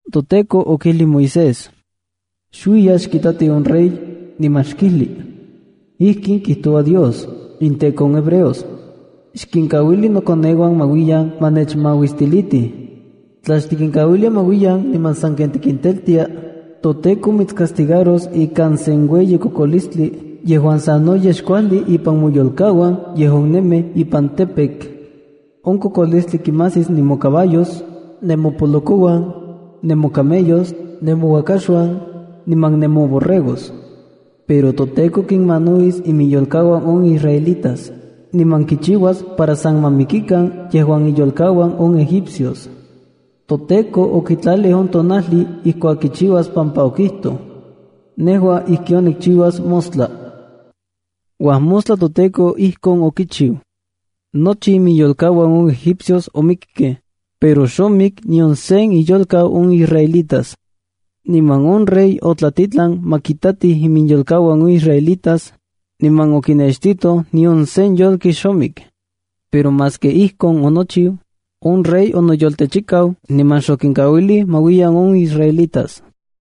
ToTEKO okijlij Moisés: —Xuiya xkitati on rey, niman xkijli: “Ijkin kijtoua Dios, inTEKO on hebreos: ‘Xkinkauili nokoneuan ma uiyan ma nechmauistilitij. Tla xtikinkauilia ma uiyan niman saken tikinteltia, toTEKO mitscastigaros ikan sen ueyi kokolistli yejuan sanoyej xkuajli ipan moyolkauan yejuan nemij ipan campo. On kokolistli kimajsis nemocaballos, nemopolokouan, nemocamellos, nemouakaxuan, niman nemoborregos. Pero toTEKO kinmanauis iminyolkauan on israelitas, niman kichiuas para san ma mikikan yejuan inyolkauan on egipcios.” ToTEKO okitlalij on tonajli ijkuak kichiuas pampa okijtoj: —Nejua ijkon nikchiuas mostla. Uajmostla toTEKO ijkon okichiu. Nochi iminyolkauan on egipcios omikkej, pero xomik nion sen inyolkau on israelitas. Niman on rey otlatitlan ma kitatij iminyolkauan on israelitas, niman okinextitoj nion sen yolki xomik. Pero maski ijkon onochiu, on rey onoyoltechikau niman xokinkauilij ma uiyan on israelitas.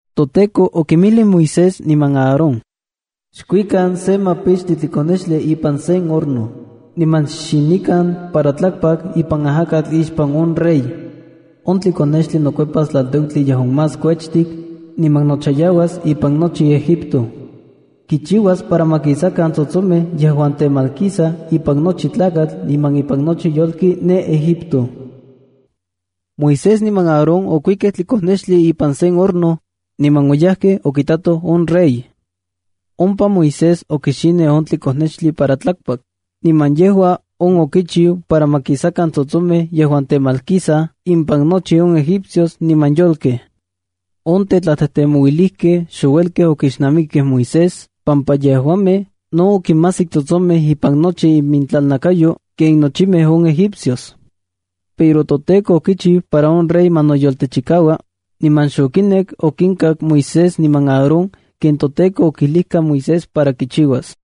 ToTEKO okinmijlij Moisés niman Aarón: —Xkuikan se mapichtli tlikonextli ipan sen horno, niman xxinikan para tlakpak ipan ajakatl ixpan on rey. On tlikonextli nokuepas tlalteutli yejuan más kuechtik, niman nochayauas ipan nochi Egipto. Kichiuas para ma kisakan tsotsomej yejuan temalkisaj ipan nochi tlakatl niman ipan nochi yolki ne Egipto. Moisés niman Aarón okuikej tlikonextli ipan sen horno, niman oyajkej okitatoj on rey. Ompa Moisés okixinij on tlikonextli para tlakpak, niman yejua on okichiu para ma kisakan tsotsomej yejuan temalkisaj ipan nochi on egipcios niman yolkej. On tetlatejtemouilijkej xouelkej okixnamikej Moisés pampa yejuamej no okimajsik tsotsomej ipan nochi imintlalnakayo ken nochimej on egipcios. Pero toTEKO okichiu para on rey ma noyoltechikaua, niman xokinek okinkak Moisés niman Aarón ken toTEKO okijlijka Moisés para kichiuas.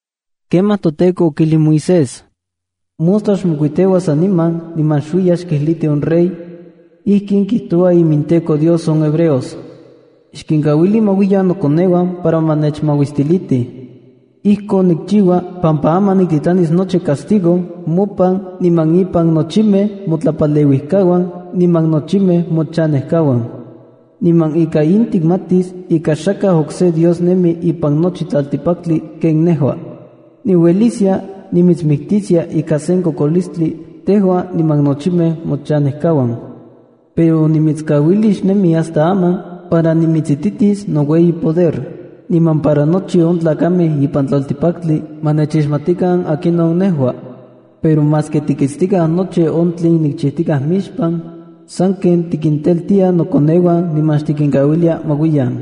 Kemaj toTEKO okijlij Moisés: —Mostla xmokuiteua saniman niman xuiya xkijliti on rey: “Ijkin kijtoua iminTEKO Dios on hebreos: Xkinkauili ma uiyan nokoneuan para ma nechmauistilitij. Ijkon nikchiua pampa aman niktitlanis nochi nocastigo mopan niman impan nochimej motlapaleuijkauan niman nochimej mochanejkauan. Niman ika in tikmatis ika xakaj okse Dios nemi ipan nochi tlaltikpaktli ken nejua. Niueliskia nimitsmiktiskia ika sen kokolistli tejua niman nochimej mochanejkauan. Pero onimitskauilij xnemi hasta aman para nimitsititis noueyi poder, niman para nochi on tlakamej ipan tlaltikpaktli ma nechixmatikan akinon nejua. Pero maski tikitstikaj nochi on tlen nikchijtikaj mixpan, sanken tikinteltia nokoneuan niman xtikinkauilia ma uiyan.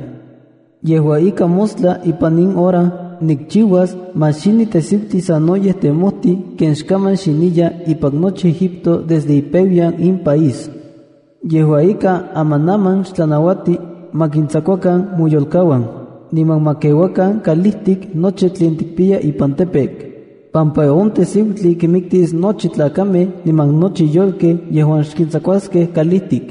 Yejua ika, mostla ipan in hora nikchiuas ma xini tejsiutli sanoyej temojtij ken xkaman xiniya ipan nochi Egipto desde ipeuyan in país. Yejua ika, amanaman xtlanauati ma kintsakuakan moyolkauan, niman ma keuakan kalijtik nochi tlen tikpiya ipan campo, pampa on tejsiutli kinmiktis nochi tlakamej niman nochi yolkej yejuan xkintsakuaskej kalijtik.”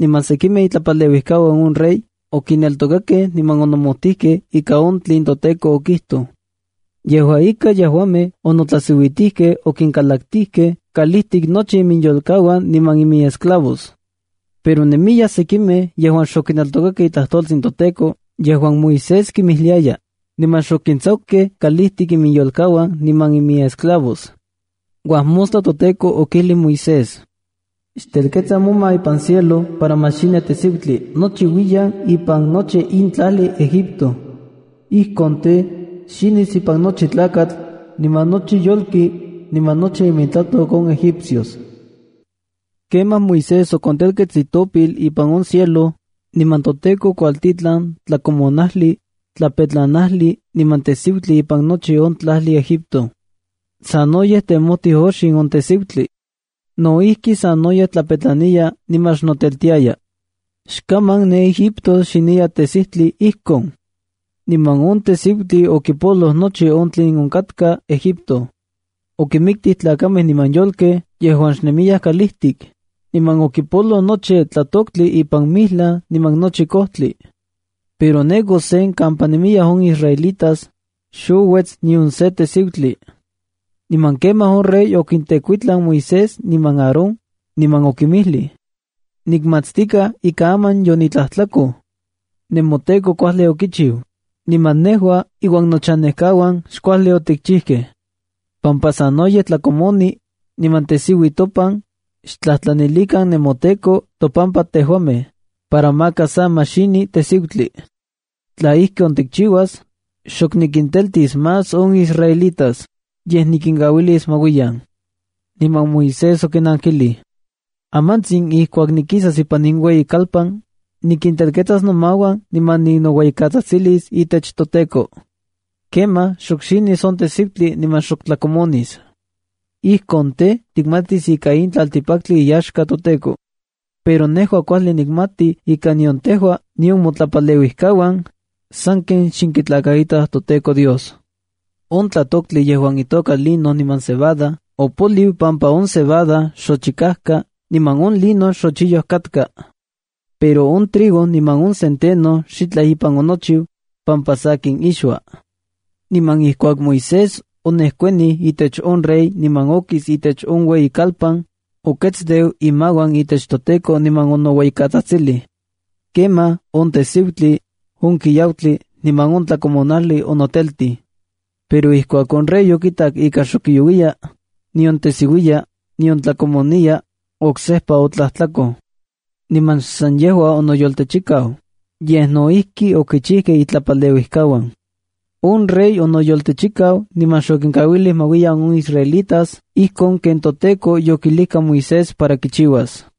Niman sekimej itlapaleuijkauan on rey okineltokakej niman onomojtijkej ika on tlen toTEKO okijtoj. Yejua ika, yejuamej onotlajsiuitijkej okinkalaktijkej kalijtik nochi iminyolkauan niman iminesclavos. Pero nemiyaj sekimej yejuan xokineltokakej itlajtoltsin toTEKO yejuan Moisés kimijliaya, niman xokintsakukej kalijtik iminyolkauan niman iminesclavos. Uajmostla toTEKO okijlij Moisés: —Xtelketsa moma ipan cielo para ma xini tejsiutli nochiuiyan ipan nochi in tlajli Egipto. Ijkon tej, xinis ipan nochi tlakatl, niman nochi yolki, niman nochi imintlatok on Egipcios. Kemaj Moisés okontelkets itopil ipan on cielo, niman toTEKO okuajtitlan tlakomonajli, tlapetlanajli niman tejsiutli ipan nochi on tlajli Egipto. Sanoyej temojti oxin on tejsiutli. No ijki, sanoyej tlapetlaniya niman xnoteltiaya. Xkaman ne Egipto xiniya tejsiutli ijkon. Niman on tejsiutli okipoloj nochi on tlen onkatka Egipto. Okinmiktij tlakamej niman yolkej yejuan xnemiyaj kalijtik, niman okipoloj nochi tlatoktli ipan mijlaj niman nochi kojtli. Pero ne Gosén kampa nemiyaj on israelitas, xouets nion sen tejsiutli. Niman kemaj on rey okintekuitlan Moisés niman Aarón, niman okinmijlij: —Nikmatstikaj ika aman yonitlajtlakoj. NemoTEKO kuajli okichiu, niman nejua iuan nochanekauan xkuajli otikchijkej. Pampa sanoyej tlakomoni, niman tejsiui topan, xtlajtlanilikan nemoTEKO topampa tejuamej, para maka sa ma xini tejsiutli. Tla ijkon tikchiuas, xok nikinteltis más on israelitas, yej nikinkauilis ma uiyan. Niman Moisés okinankilij: —Amantsin ijkuak nikisas ipan in ueyikalpan, nikintelketsas nomauan niman ninoueyikatsajtsilis itech toTEKO. Kemaj xok xinis on tejsiutli niman xok tlakomonis. Ijkon tej, tikmatis ika in tlaltikpaktli iyaxka toTEKO. Pero nejua kuajli nikmati ika nion tejua, nion motlapaleuijkauan, sanken xnenkitlakaitaj toTEKO Dios. On tlatoktli yejuan itoka lino niman cebada opoliu pampa on cebada yochikajka niman on lino xochiyoj katka. Pero on trigo niman on centeno xitlaj ipan onochiu, pampa sakin ixua. Niman ijkuak Moisés onejkuanij itech on rey niman okis itech on ueyikalpan, oketsteu imauan itech toTEKO niman onoueyikatsajtsilij. Kemaj on tejsiutli, on kiautli niman on tlakomonajli onoteltij. Pero ijkuak on rey okitak ika xok kiauiya, nion tesiuiya, nion tlakomoniya, oksejpa otlajtlakoj. Niman xsan yejua onoyoltechikau, yej no ijki okichijkej itlapaleuijkauan. On rey onoyoltechikau niman xokinkauilij ma uiyan on israelitas ijkon ken toTEKO yokijlijka Moisés para kichiuas.